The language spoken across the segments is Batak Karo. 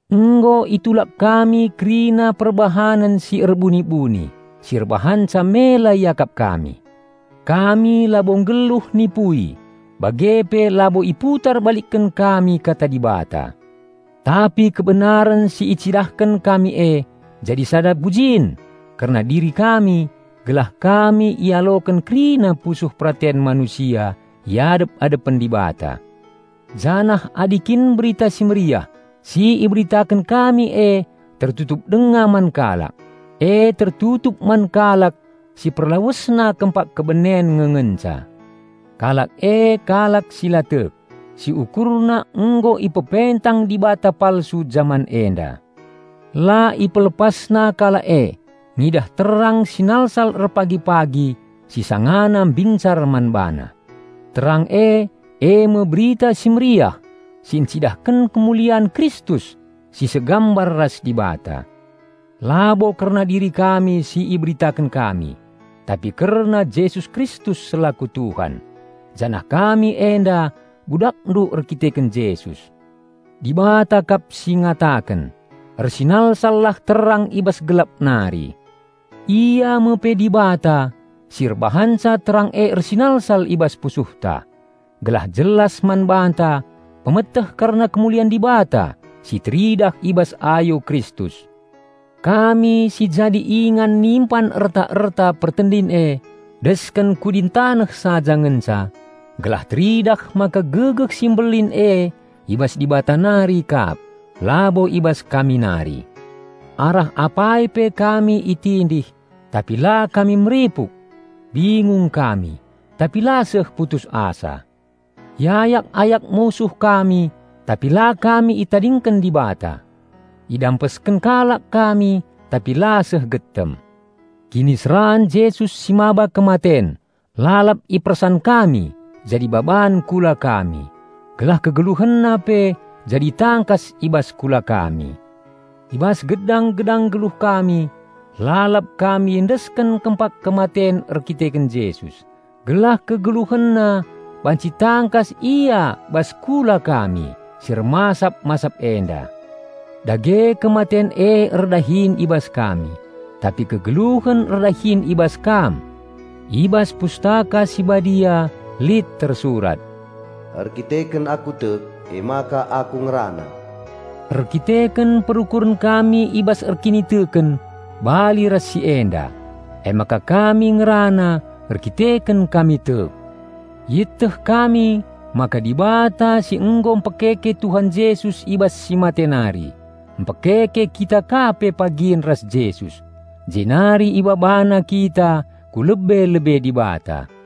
Nggo itulak kami kerina perbahanen si erbuni-buni si erbahanca mela iakap kami. Kami labo nggeluh nipui, bage pe labo iputar balikken kami Kata Dibata. Tapi kebenaren si icidahken kami e jadi sada pujin kerna diri kami gelah kami ialoken kerina pusuh peraten manusia i adep-adepen Dibata. Janah adi kin Berita Si Mehuli si iberitaken kami e tertutup denga man kalak, e tertutup man kalak si perlawesna kempak kebenen nge ngenca. Kalak e kalak si la tek, si ukurna nggo ipepentang dibata palsu jaman enda. La ipelepasna kalak e ngidah terang sinalsal erpagi-pagi si sangana mbincar man bana. Terang e, eme Berita Si Mehuli si encidahken kemulian Kristus si segambar ras Dibata. Labo kerna diri kami si iberitaken kami, tapi kerna Jesus Kristus selaku Tuhan, janah kami enda budakndu erdandanken Jesus. Dibata kap si ngataken, "Ersinalsallah terang i bas gelap nari." Ia me pe Dibata si erbahanca terang e ersinalsal i bas pusuhta, gelah jelas man banta pemeteh kerna kemulian Dibata si teridah i bas ayo Kristus. Kami si jadi ingan nimpan erta-erta pertendin e, desken kudin taneh saja ngenca, gelah teridah maka gegeh si mbelin e i bas Dibata nari kap, labo i bas kami nari. Arah apai pe kami itindih, tapi la kami meripuk. Bingung kami, tapi la seh putus asa. Iayak-ayak musuh kami, tapi la kami itadingken Dibata. Idampesken kalak kami, tapi la seh getem. Kiniseran Jesus si maba kematen lalap ipersan kami jadi baban kula kami, gelah KegeluhenNa pe jadi tangkas i bas kula kami. I bas gedang-gedang geluh kami, lalap kami iendesken kempak kematen erdandanken Jesus, gelah KegeluhenNa banci tangkas ia bas kula kami si ermasap-masap enda. Dage kematen e erdahin i bas kami, tapi kegeluhen erdahin i bas kam. I bas Pustaka Si Badia lit tersurat, "Erkiteken aku tek, emaka aku ngerana." Erkiteken perukuren kami i bas erkiniteken bali ras si enda, emaka kami ngerana, erdandanken kami tek. Ieteh kami maka Dibata si nggo mpekeke Tuhan Jesus i bas si mate nari, mpekeke kita ka pe pagin ras Jesus, jenari IbabaNa kita ku lebe-lebe Dibata.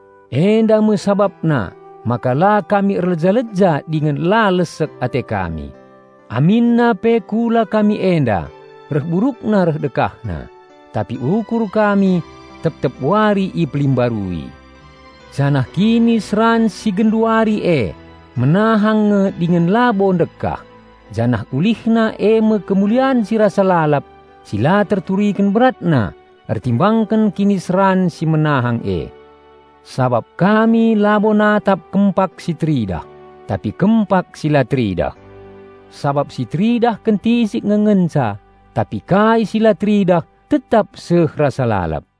Enda me sabapna maka la kami erleja-leja dingen la lesek ate kami. Aminna pe kula kami enda reh burukna reh dekahna, tapi ukur kami tep-tep wari ipelimbarui. Janah kiniseran si genduari e menahang nge dingen labo ndekah, janah ulihna eme kemulian si rasa lalap si la terturiken beratna ertimbangken kiniseran si menahang e. Sabap kami labo natap kempak si teridah, tapi kempak si la teridah. Sabap si teridah kentisik nge ngenca; tapi kai si la teridah tetap seh rasa lalap.